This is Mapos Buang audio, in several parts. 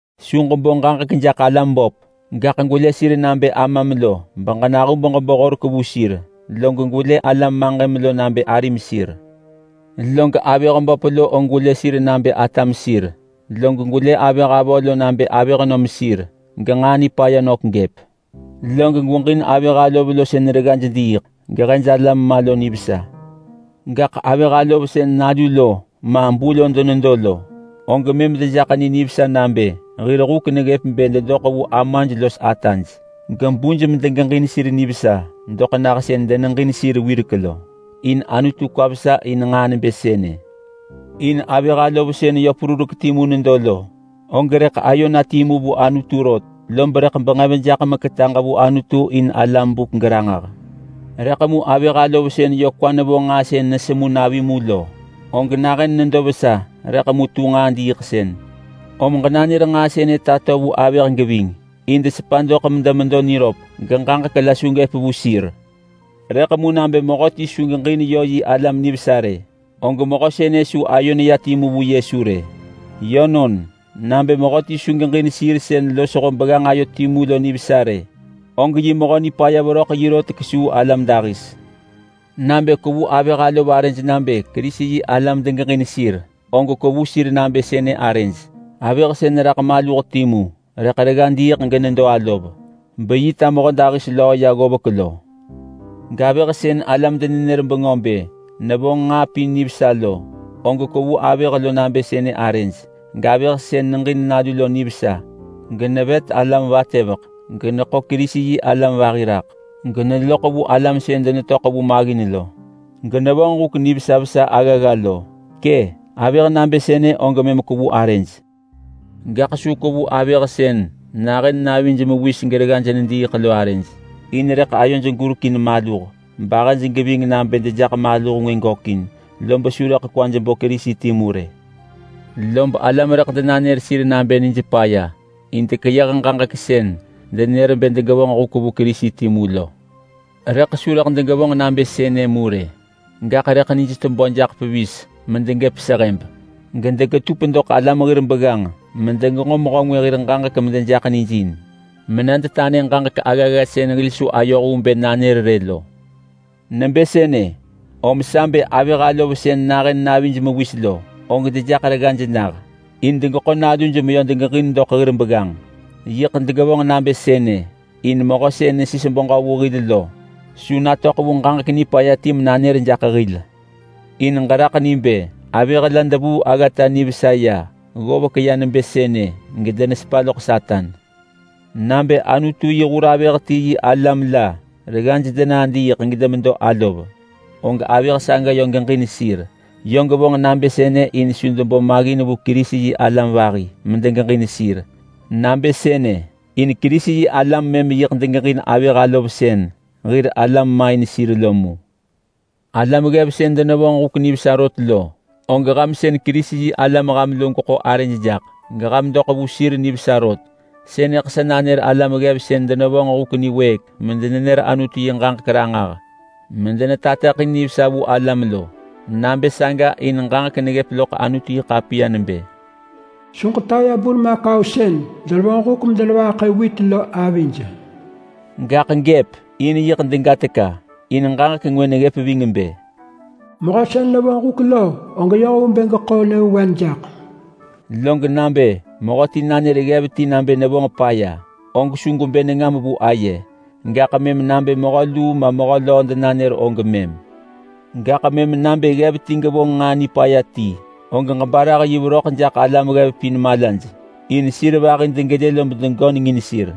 Su ġebo ġaġek jaḳ alam böp, gaḳ gwelë sir nabë amam lo benahub ġebo horek vu sir. Log gwelë alam maġëm nabë arim lo sir. Log avëh böp og gwelë sir nabë atam lo, log gwelë avëh avö nabë avëhnöm lo genġaa nipaya nök gëp. Log gweġin avëh alov lo sën reggaj diiḳ gehej alam ma lo nivesa. Gaḳ avëh alov sën nalu lo ma bu lo denedo lo, og mëm dejaḳ ni nivesa nabë hir huk neggëp bë dedoḳ vu amaj los ataj gebuj medegeġin sir nivesa doḳ nah sën deneġin sir wirek lo. In Anutu kwa vesa in nġaa nebë sënë. In avëh alov sën yö perurek timu nedo lo, og rëḳ ayo na timu vu Anutu rot, lob rëḳ benġev jaḳ meketaġ na vu Anutu in alam buk geranġah. Rëḳ mu avëh alov sën yö kwa nevo nġaa sën nesemu navi mu lo, og nahën nedo vesa rëḳ mu tu nġaa diiḳsën. Om ġenanër nġaa sënë tato vu avëh geving, in desepa doḳ medemedo niröp geġaġek la su gëp vu sir. Rëḳ mu nabë mehöti su geġin yö yi alam nivesa rë, og mehö sënë su ayo neya timu vu Yesu rë. Yönon, nabë mehöti su geġin sir sën losho begganġ ayo timu lo nivesa rë, og yi mehö nipaya veröḳ yi rot kesuu alam dahis. Lob nabë kwevu avëh alov arëj nabë Kerisi-yi-alam degeġin sir, og kwevu sir nabë sënë arëj: Avëh sën raḳ maluh timu rëḳ diiḳ genedo alov, lob yi ta mehödahis löö ya ggovek lo. Gavëh sën alam denenër bengö bë nevonġ nġaa pin nivesa lo, og kwevu avëh nabë sënë lo arëj. Gavëh sën neġin nalu lo nivesa, genevet alam vatëveḳ, geneḳo Kerisi-yi-alam vahi raḳ geneloḳ vu alam sën denetöḳ vu maggin lo, genevonġ huk nivesa vesa aggagga lo. Kë, avëh nabë sënë og mëm kwevu arëj. Gaḳ su kwevu avëh sën nahën navij mewis gereggaj nediiḳ lo arëj, in rëḳ ayoj gurek in maluh, bahëj geving nabë dejaḳ maluh ngwë gökin, lob su kwaj bo Kerisi timu rë. Lob alam rëḳ denanër sir nabë nij paya, in dekeyëh ġaġek sën denër bë degevonġ huk vu Kerisi timu lo. Rëḳ su rëḳ degevonġ nabë sënë mu rë. Gaḳ rëḳ nij tebö jaḳ pevis medegëp sehëb, gedegetup doḳ alam hir begganġ medenenġo mehö ngwë hir ġaġek medejaḳ nij in mena detanë medenanër ġaġek aggagga sën hil su ayoh vu bë nanër rë lo. Nebë sënë om sa bë avëh alov sën nahën navij mewis lo, og dejaḳ reggaj nah in degeḳo naluj meyö degeġin doḳ hir begganġ. Yiḳ degevonġ nabë sënë in Mehö sën nesis beġö vu hil lo su natöḳ vu ġaġek nipaya ti menanër jaḳ hil. In ġeraḳ ni bë avëh la devuu aggata nivesa ya ggovek ya nebë sënë gedenesepa loḳ Satan. Nabë Anutu yi hur avëh ti yi alam la reggaj denadiiḳ gedemedo alov, og avëh saga yö geġin sir. Yö gevonġ nabë sënë in su debo maggin vu Kerisi-yi-alam vahi medegeġin sir. Nabë sënë in Kerisi-yi-alam mëm yiḳ degeġin avëh alov sën hir alam main sir lo mu. Alam ggev sën denevonġ huk nivesa rot lo, og ham sën Kerisi-yi-alam ham lo gweḳo arëj jaḳ geham doḳ vu sir nivesa rot. Sënëḳ sa nanër alam ggev sën denevonġ huk niwëëk medenenër Anutu yi ġaġek ranġah medenetateḳin nivesa vu alam lo. Nabë saga in ġaġek neggëp loḳ Anutu-yi-ḳapiya nebë, “Su ġetaya burmakau sën denevonġ huk bedenevaḳë wit lo avij,” gaḳ gëp in yiḳ dega teka! In ġaġek ngwë neggëp ving bë, “Mehö sën nevonġ huk lo, og yoh vu bë geḳo nyëvewen jaḳ.” Log nabë mehö ti nanër ggev ti nabë nevonġ paya, og su gwebë nengam vu aye, gaḳ mëm nabë mehö luu ma mehö löö denanër og mëm. Gaḳ mëm nabë ggev ti gevonġ nġaa nipaya ti, og ġebarah yi veröḳ jaḳ alam ggev pin malaj, in sir vahi degelë lob degöneng in sir.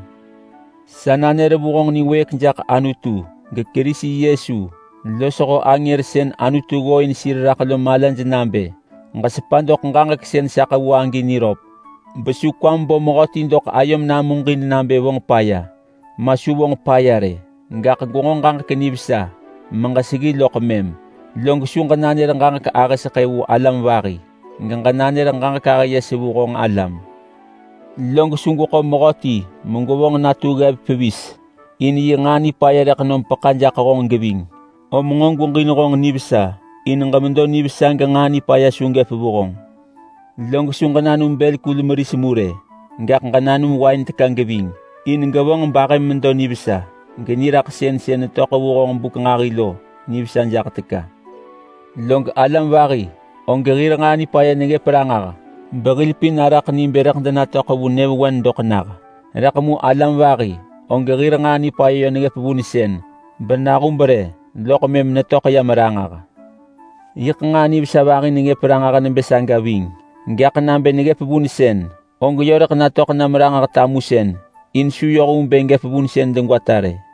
Sa nanër vu honġ niwëëk jaḳ Anutu geKerisi Yesu losho angër sën Anutu ggooin sir raḳ lo malaj nabë: Ġesepa doḳ ġaġek sën sa ḳevu agi niröp, besu kwam bo mehöti doḳ ayom namuġin nabë vonġ paya, ma su vonġ paya rë, gaḳ gwenġo ġaġek nivesa meġeseggi loḳ mëm. Log su ġenanër ġaġek ahë seḳë vu alam vahi geġenanër ġaġek ahë yes vu honġ alam. Log su gweḳo mehö ti megwevonġ natu ggev pevis rë, in yi nġaa nipaya rëḳ nom peḳa jaḳ honġ geving, om nġo gweġin honġ nivesa in ġemedo nivesa genġaa nipaya su gëp vu honġ. Log su ġenanum bël kul meris mu rë, gaḳ ġenanum wain teka geving, in gevonġ bahëm medo nivesa, geniraḳsën sën netöḳ vu honġ buk nġahi lo nivesa jaḳ teka. Log alam vahi, og hir nġaa nipaya neggëp ranġah behil pin araḳ ni bë rëḳ denatöḳ vu nyëvewen doḳ nah, rëḳ mu alam vahi, og hir nġaa nipaya yö neggëp vunsën, benahub rë loḳ mëm netöḳ yam ranġah. Yiḳ nġaa nivesa vahi neggëp ranġah nebë saga ving, gaḳ nabë neggëp vunsën og yö rëḳ netöḳ yam ranġah tamusën in su yoh vu bë gëp vunsën degwata rë.